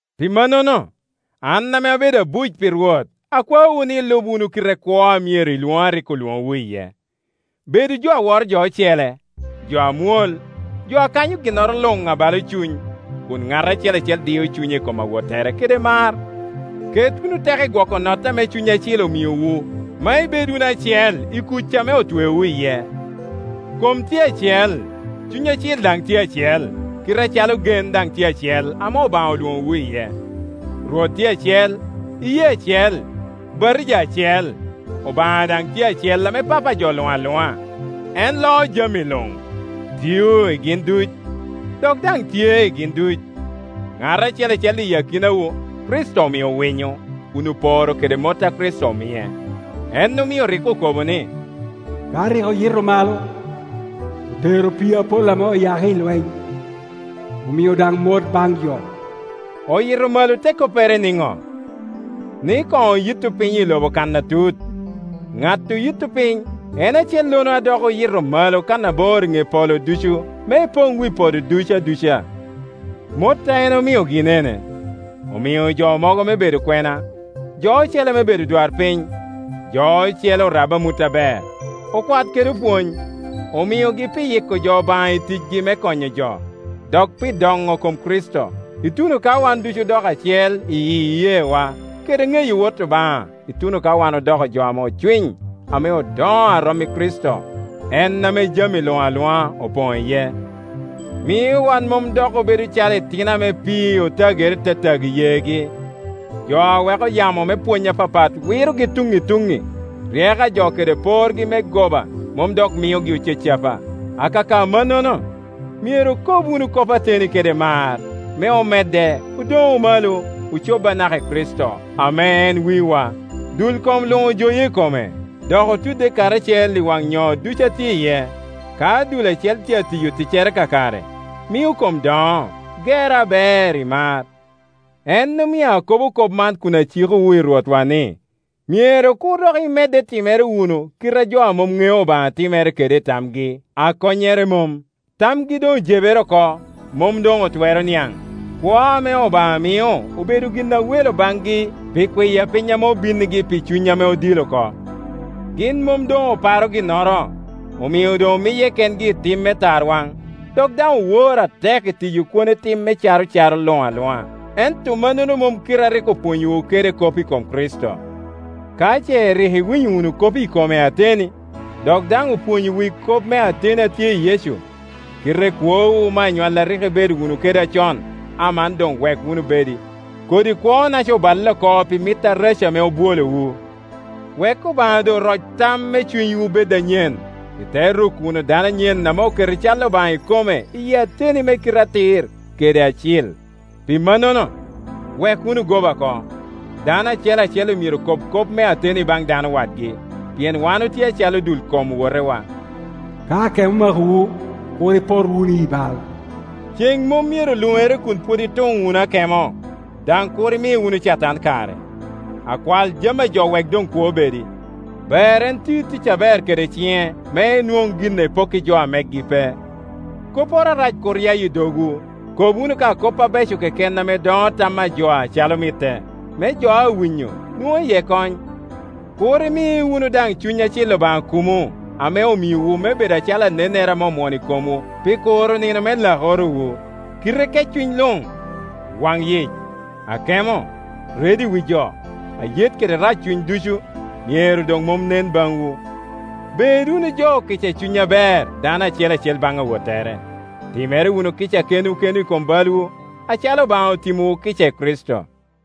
Pi mannono, an ame abedo abuc pi Rwot akwaowu ni ilub wunu kite kwo a myero i lwoŋo a rik olwoŋowu iye. Bedu jo a woro jo ocele, jo amwol, jo a kanyo ginnoro luŋ abalo cuny, kun ŋat acel acel dio cunye i kom awottere kede mar. Ket wunu teko i gwoko notte ame Cuny Acil omiowu me ibed wunu acel i kuc ame otweowu iye. Kom tye acel, Cuny Acil daŋ tye acel, kite acalo gen daŋ tye acel ame Obaŋa olwoŋowu iye. Rwot tye acel, iyee acel, batija acel. Obaŋa daŋ tye acel ame Papa a jo luŋ aluŋa. En loo jami luŋ, tio i gin duc, dok daŋ tye i gin duc. Ŋat acel acel i akinawa Kricito omio winyo, kun oporo kede mot a Kricito omie. En omio rik okobo ni, “Ka rik oyito malo, otero opii apol ame oyako i lweny, omio daŋ mot baŋ jo.” “Oyito malo” te koppere niŋo? Ni koŋ oyitto piny i lobo kan atut. Ŋat oyitto piny en acellono a dok oyito malo kannabor i ŋe polo ducu me epoŋ wi podo duc aduca. Mot a en omio gin ene: omio jo mogo me bedo okwena, jo ocele me bedo odwarpiny, jo ocele orab amut aber, okwat kede opwony. Omiogi pi yiko jo Obaŋa i ticgi me konyo jo, dok pi doŋo kom Kricito, ituno ka wan ducu odoko acel i iyeewa kede i ŋeyo Wot Obaŋa ituno ka wan odoko jo ame ocwiny, ame odoŋo a rom i Kricito, en ame jami luŋ aluŋa opoŋ iye. Mio wan mom dok obedo calo itino ame pii otagere tatago yeegi, jo a weko yamo me pwony apapat wirogi tuŋŋi i tuŋŋi, ryeko a jo kede porgi me goba mom dok miogi ocacapa. Akaka mannono, myero okob wunu kop ateni kede mar, me omedde, odoŋu malo, ocob anaka i Kricito, ame en wiwa. Dul kom luŋ ojoye i kome, dok otudde karacel i waŋ nyoo ducu a tye iye. Ka dul acel tye atiyo ticcere kakare, mio kom doŋo, gerre aber i mar. En omio akobo kop man kun acikowu i Rwotwa ni, myero kur dok imedde timere wunu kite a jo a mom ŋeo Obaŋa timere kede i tamgi a konnyere mom. Tamgi doŋ ojebere oko, mom doŋ otwero niaŋ, kwo ame Obaŋa mio obedo gin a welo baŋgi pi kwiya piny ame obinnigi pi cuny ame odil oko. Gin mom doŋ oparo ginnoro, omio doŋ omiye kengi i tim me tarwaŋ, dok daŋ owor atek i tiyo kwone tim me caro caro luŋ aluŋa. Ento mannono mom kite a rik opwonyowu kede kop i kom Kricito. Ka ce rik iwinyo wunu kop ikome ateni, dok daŋ opwonyowu i kop me ateni a tye i Yecu. Kite kwowu me anywalli a rik ibedo wunu kede acon, aman doŋ wek wunu bedi; kodi kwonaca oballe oko pi mit areco ame obwolowu. Wek Obaŋa doŋ roc tam me cunywu bed anyen, ite ruko wunu dano anyen ame oketo i cal Obaŋa ikome iyi ateni me kite atir kede acil. Pi mannono, wek wunu goba oko; dano acel acel myero kob kop me ateni baŋ dano wadgi, pien wan otye acalo dul kom owotewa. Ka akemo omakowu, kur ipot wunu i bal; ceŋ mom myero luŋere kun pwod ituŋ wunu akemo, daŋ kur imi wunu Catan kare. Akwal jami a jo wek doŋ kwo bedi; ber en ti tic aber kede ciŋe, me enwoŋ gin epokki jo a megi pe. Kopporo arac kur ya i dogwu; kob wunu ka kop abeco keken ame doŋo tam a jo acalo mitte, me jo a winyo nwoŋ iye kony. Kur imi wunu daŋ Cuny Acil Obaŋa kumo, ame omiowu me bed calo anennere ame omwono i komwu pi kuro nino me lakorowu. Kite keccuny luŋ, waŋyic, akemo, redo i wi jo, ayet kede raccuny ducu myero doŋ mom i nen baŋwu. Bed wunu jo okica i cuny aber, dano acel acel baŋ awottere. Timmere wunu kica kenwu kenwu i kom balwu, acalo Obaŋa otimowu kica i Kricito.